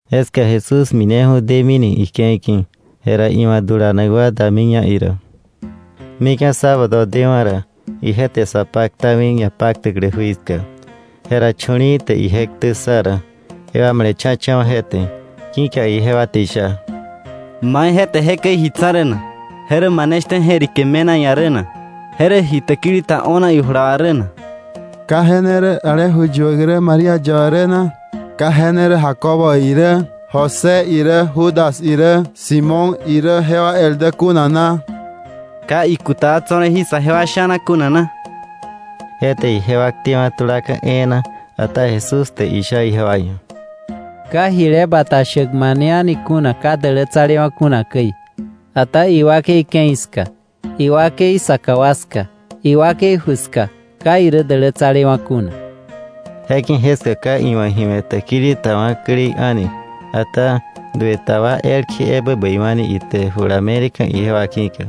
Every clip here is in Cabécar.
Jeska Jesús mineju̱ demini ike̱i ki̱, jera iwa̱ dulanak wa damiña ira. Mika̱ sábado dewa̱ ra, ije te sa paktami ñapaktäklä jui ska. Jera chu̱li̱i̱ te ije ktä ssa ra, jewa male̱cha̱cha̱wa̱ je te, ki̱ka ijewa te isha: —¿Mai je te jekäi ji tsa̱ rä na? ¿Je rä mane shtä je̱rike me̱na iia̱ rä na? ¿Je rä ji täkili ta o̱na ijula wa rä na? ¿Ka je ne rä ale ju yuäk rä, María yaba rä na? ¿Ka je ne rä Jacobo irä, José irä, Judas irä, Simón irä, jewa el dä kuna na? ¿Ka ikuta wa tso̱ rä jí sajewa sha̱na kuna na? Je te ijewa ktewa̱ tulaka̱ e̱e̱na. Ata Jesús te isha ijewa ia̱: —Ka jile bata shäk mane a̱ni kuna ka dälätsalewa̱ kuna käi, ata iwakei ke̱i ska, iwakei saka wa ska, iwakei ju ska ka irä dälätsalewa̱ kuna. Je ki̱ jeska ka iwa̱ ji we̱ täkili ta wa̱klei a̱ni, ata dueta wa elkje ebä bäiwa̱ni ite jula me̱leka̱ ijewa ki̱ka.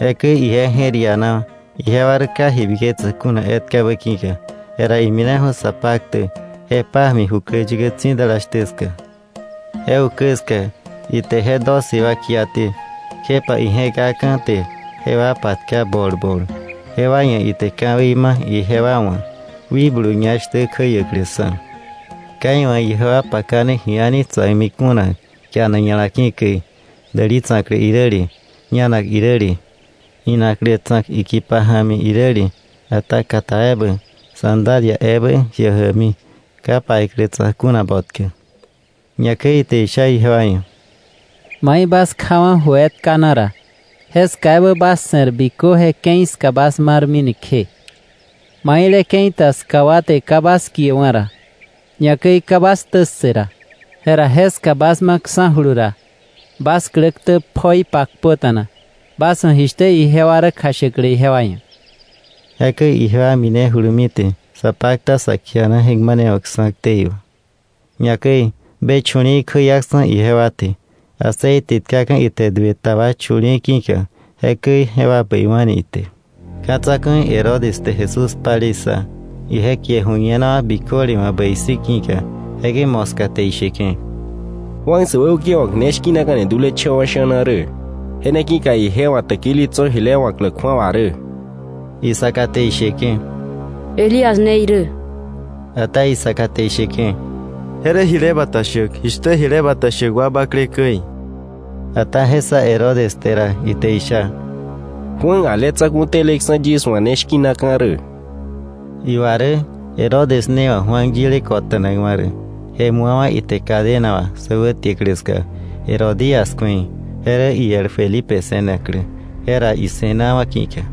Jekäi ije je̱r ianawa̱, ijewa rä ka ji biketsäk kuna etkabä ki̱ka. Jera imineju̱ sa paktäk je pája̱mi jukläyäkä tsi̱dala shtä ska. Je ukä ska ite je doce wa kiaté, kjepa ije̱kaka̱ te jewa patka bol bol. Jewa ia̱ ite ka̱wei ma ijewa wa̱ wikblu ñá shtä kjäiäkläksa̱. Ka iwa̱ ijewa pakane ji a̱ni tsa̱kmi kuna kianak ña̱la ki̱ käi, däli tsa̱klä iräle, ñanak iräle, inaklä tsa̱k ikipa ja̱mi iräle, ata kata ebä; sandalia ebä jiä jämi, ka paiklä tsa̱k kuna botkä. Ñakäi ite isha ijewa ia̱: —Mai bas kjawa̱ ju etka na ra, jeska ebä bas se̱r bikö je ke̱i ska bas marmini kje. Maile ke̱i ta ska wa te ka bas kiewa̱ ra, ñakäi ka bas ktä ssë ra, jera jeska bas maksa̱julu ra, bas klä ktä pjoi pakpöta̱na, bas wa̱ jishtä ijewa rä kjashäklä ijewa ia̱. Jekäi ijewa minejulumi te sa pakta, sa kiana je̱k manewa̱kksa̱ ktei wà. Ñakäi be chu̱li̱i̱ kjäiaksa̱ ijewa te. Aceite tkaka̱ ite duë ta wa chu̱li̱i̱ ki̱ka, jekäi jewa bäiwa̱ni ite. Ka̱ tsa̱ku̱i Herodes te Jesús palei ssa, ije kie ju̱ñenawa̱ biköle wa̱ bäi si̱ ki̱ka. Jekäi moska te isheke̱: —Juan säwäukewa̱k ne shki̱naka̱ni dulecha̱wa̱ wa sha̱na rä. Je ne ki̱ka ije wa̱ täkili tso̱ jile wa̱klä kju̱awa rä. Isaka te isheke̱: —Elías ne irä. Ata isaka te isheke̱: —Je rä jile bata shäk, jishtä jile bata shäk wa bakle käi. Ata je ssa Herodes te ra, ite isha: —¡Juan ale tsa̱ku̱ teleksa̱ yis wa̱ ne shki̱naka̱ rä! Iwa rä Herodes ne wa̱ Juan yile kolonakwa̱ rä, je mu̱awa̱ ite cadena wà sä wätiäklä ska Herodías kju̱ei, je rä iel Felipe se̱naklä, je ra ise̱nawa̱ ki̱ka.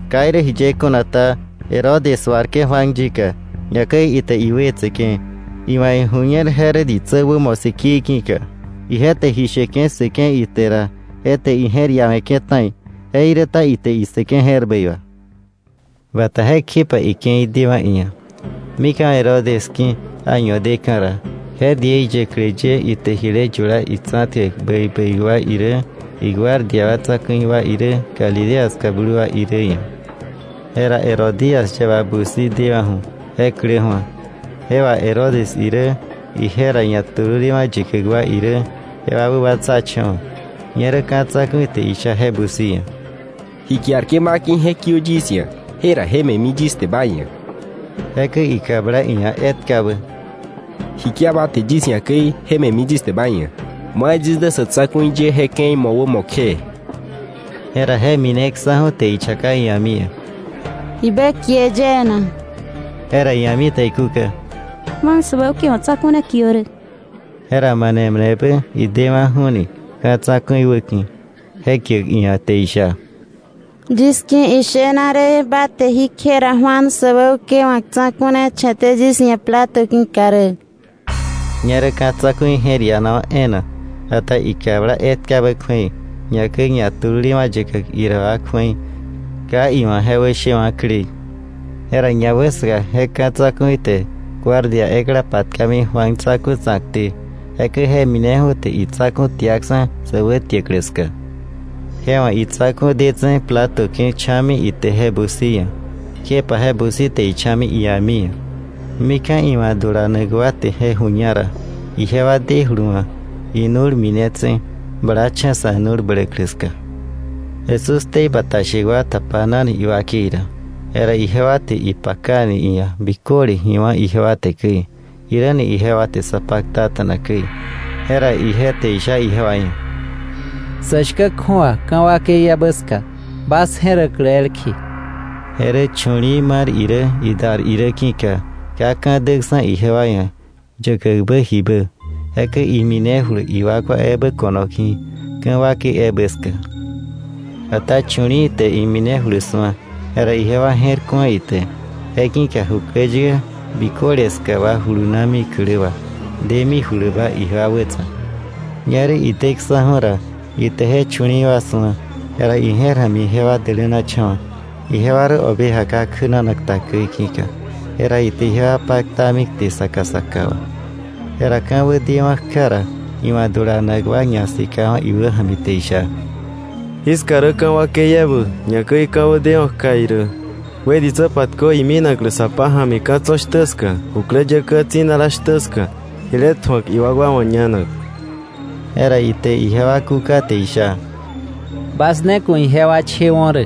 Ka irä jiye kuna ta, Herodes suarke̱ Juan yika, ñakäi ite iwetseke̱, iwa̱ iju̱ñer je rä ditsä wämo sikii ki̱ka. Ije te ji sheke̱ ssëke̱ ite ra, je te ije̱r iawe̱ke̱ ta̱i, jeiräta ite issëke̱ je̱r bäi wà. Bata jekjepa ike̱i dewa̱ iia̱. Mika̱ Herodes ki̱ año deka̱ ra, je diei yäklä ye ite jile yula itsa̱tkäk bäi bäi wa irä, iguardia wa tsa̱ku̱i wa irä, Galilea ska blu wa irä ia̱. Jera Herodías yaba busi dewa̱ju̱, je klä ju̱a; je wà Herodes irä, ije ra ñatululewa̱ yäkäk wa irä, jewa wäbatsacha̱wa̱. Ñerä ka̱ tsa̱ku̱i te isha je busi ia̱: —Ji kiarke̱ ba ki̱ je kiö yis ia̱, jera je me̱mi yis te ma ia̱. Jekäi ikabla iia̱ etkabä: —Ji kia ba te yis ia̱ käi me̱mi yis te ba ia̱, yis dä sa̱ tsa̱ku̱i ye je ke̱i mowämo kje. Jera je mineksa̱ju̱ te ichaka ia̱mi ia̱: —¿Jibä kie yie na? Jera ia̱mi te ikúka: —Juan säwäukewa̱k tsa̱ku̱ ne kiö rä. Jera mane manebä idewa̱ju̱ni ka̱ tsa̱ku̱i wäki̱ je kiäk iia̱, te isha: —Yis ki̱ ishena rä, ba te jí kje ra Juan säwäukewa̱k tsa̱ku̱ ne che̱té yis ia̱ plato ki̱ka rä. Ñerä ka̱ tsa̱ku̱i je̱r ianawa̱ e̱e̱na. Ata ikabla etkabä kju̱ei, ñakäi ñatululewa̱ yäkäk ira wa kju̱ei, ka iwa̱ je wäshewa̱klei. Jera ñawäsaka je ka̱ tsa̱ku̱i te guardia ekla patkami Juan tsa̱ku̱ tsa̱kté, jekäi je mineju̱ te itsa̱ku̱ tiaksa̱ sä wätiäklä ska. Je wa̱ itsa̱ku̱ detse̱ plato ki̱ cha̱mi ite je busi ia̱, kjepa je busi te icha̱mi ia̱mi ia̱. Mika̱ iwa̱ dulanak wa te je ju̱ña ra, ijewa dejulu wa̱ inu̱l minetse̱ blacha̱ sa̱ nu̱l bläklä ska. Jesús ktei bata shäk wa tapanani iwakei ra. Jera ijewa te ipakani iia̱ biköle ji wá̱ ijewa te käi, jiräni ijewa te sa paktata̱na käi. Jera ije te isha ijewa ia̱: —Sä shkä kju̱awa ka̱ wakei ebä ska, bas je̱räklä elkje. Je rä chu̱li̱i̱ mar irä, idar irä, ki̱ka ka ka̱ däksa̱ ijewa ia̱ yäkäkbä jibä. Jekäi iminejulu iwakwa ebä ko̱no ki̱, ka̱ wakei ebä ska. Ata chu̱li̱i̱ te iminejulu su̱a, jera ijewa je̱r ku̱a ite. Je ki̱ka jukläyäkä biköle ska wa julunami klä wà, demijuluba ijewa wätsa̱k. Ñerä ideksa̱ju̱ ra, ite je chu̱li̱i̱wa̱ su̱a, jera ije̱r ja̱mi jewa dälänacha̱wa̱, ijewa rä oveja ka kjänanak ta käi ki̱ka. Jera ite ijewa paktami kte saka saka wa. Jera ka̱wä deewa̱ kja ra, iwa̱ dulanak wa ñasikawa̱ iwäja̱mi te isha: —Jiska rä ka̱ wakei ebä, ñakäi ka̱wä deewa̱ kja irä. Wë ditsä patkö iminaklä sa pája̱mi ka̱ tso̱ shtä ska, jukläyäkä tsi̱dala shtä ska, jile tju̱ak iwakwa wa̱ ñanak. Jera ite ijewa kúka te isha: —Bas ne ku̱ ijewa chewo̱ rä.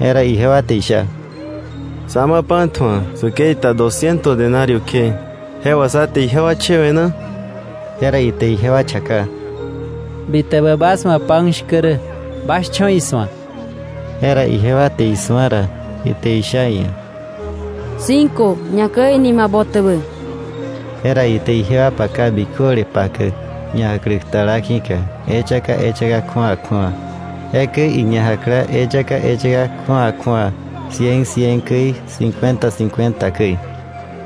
Jera ijewa te isha: —¿Sá ma pan tju̱ak säkei ta dosciento denario kje, jewa sá te ijewa chewe̱ na? Jera ite ijewa chaka: —¿Bitäbä bas wa̱ pan shkä rä? Bas cho̱ isu̱ak. Jera ijewa te isu̱a ra, ite isha iia̱: —Cinco, ñakäi nima botäbä. Jera ite ijewa paka biköle pakäk ñajäkläk tala ki̱ka eyaka eyaka kju̱awa kju̱awa. Jekäi iña jakla eyaka eyaka kju̱awa kju̱awa cien cien käi, cincuenta cincuenta käi.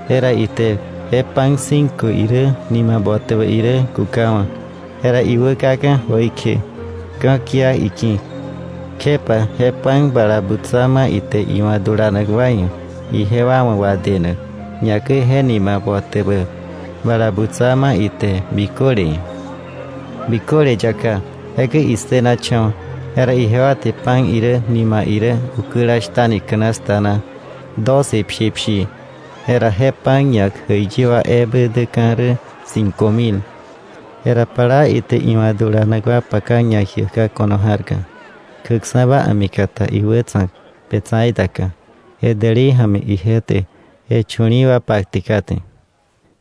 Jera ite je pan cinco irä, nima botäbä irä kukawa̱, jera iwä kaka̱ jöikje ka̱kia iki̱, kjepa je pan bala butsa ma ite iwa̱ dulanak wa ia̱ ijewa wa̱ wadenak, ñakäi je nima botäbä bala butsa ma ite biköle ia̱. Biköle yaká, jekäi issënacha̱wa̱. Jera ijewa te pan irä, nima irä, ukäla shtani canasta na doce pshipshii. Jera je pan ñak jäiyi wa ebä däka̱ rä cinco mil. Jera plaa ite iwa̱ dulanak wa paka ñajiäkka̱ ko̱no ja̱rka, kjäkksa̱ba a̱mikata iwätsa̱k Betsaida ka, je dälei ja̱mi ije te je chu̱li̱i̱ wa patke kate.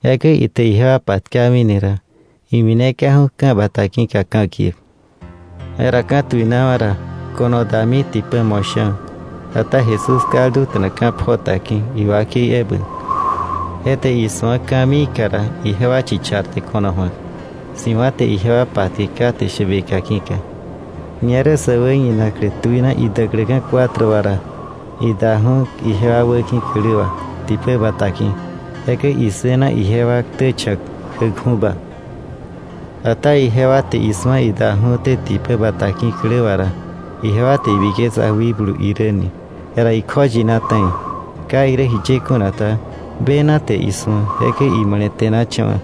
Jekäi ite ijewa patkamini ra, imineka̱ju̱ ka̱ bata ki̱ka ka̱kiäk. Jera ka̱tuinawa̱ ra, ko̱no dami tipä mo̱sha̱, ata Jesús kalduta̱na ka̱ pjota ki̱ iwakei ebä. Je te isu̱a ka̱miika ra, ijewa chicharte ko̱no ju̱ak, si̱wa̱ te ijewa patke kate shäbeka ki̱ka. Ñerä sä wäñinaklä tuina idäkläka̱ cuatro wa ra, idaju̱ ijewa wäki̱ klä wà tipä bata ki̱. Jekäi issëna ijewa ktä cha̱k kjäkju̱ba. Ata ijewa te isu̱a idaju̱té tipä bata ki̱ klä wà ra, ijewa te ibiketsa wikblu irä ni, jera ikjoyina ta̱i. Ka irä jiye kuna ta, bena te isu̱a, jekäi imale̱te̱nacha̱wa̱.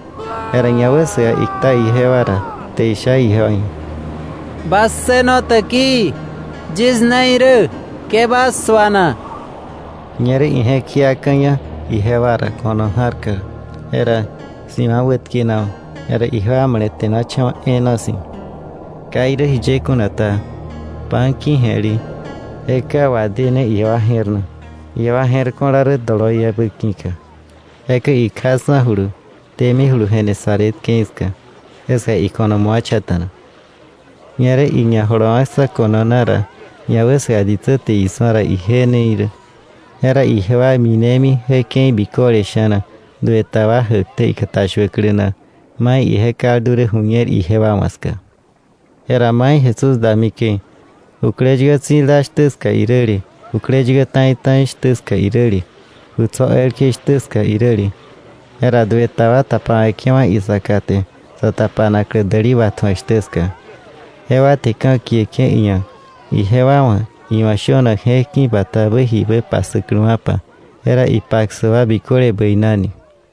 Jera ñawäsaka ikta ijewa ra te isha ijewa ia̱: —¡Bas ssëno täkii! Yis ne irä, ke bas suana. Ñerä ije̱k jiaka̱ña ijewa ra ko̱no ja̱rka, jera si̱wa̱ wätkenawa̱. Jera ijewa male̱te̱nacha̱wa̱ e̱e̱na si̱. Ka irä jiye kuna ta, pan ki̱je̱le, je ka wadéne ijewa je̱r na, ijewa je̱r ko̱la rä doloiebä ki̱ka. Jekäi ikjaksa̱julu demijulu Genesaret ke̱i ska. Jeska iko̱no mu̱acha̱ta̱na. Ñerä iñajolowa̱ksa̱ ko̱no na ra, ñawäsaka ditsä te isu̱a ra ije ne irä. Jera ijewa minemi je ke̱i biköle sha̱na duë ta wa jäkté ikatashuäklä na mai ije kaldu rä ju̱ñer ijewa wa̱ ska. Jera mai Jesús dami käi, jukläyäkä tsi̱dala shtä ska iräle, jukläyäkä ta̱i ta̱i shtä ska iräle, ju tso̱ elkje shtä ska iräle, jera duë ta wa tapawe̱ke̱wa̱ isaka te sa tapanaklä däli watju̱ak shtä ska, jewa te ka̱kieke̱ iia̱ ijewa wa̱ iwa̱ shönak je̱k ki̱ batabä jibä passäkläwa̱pa, jera ipassäk wa biköle bäinani.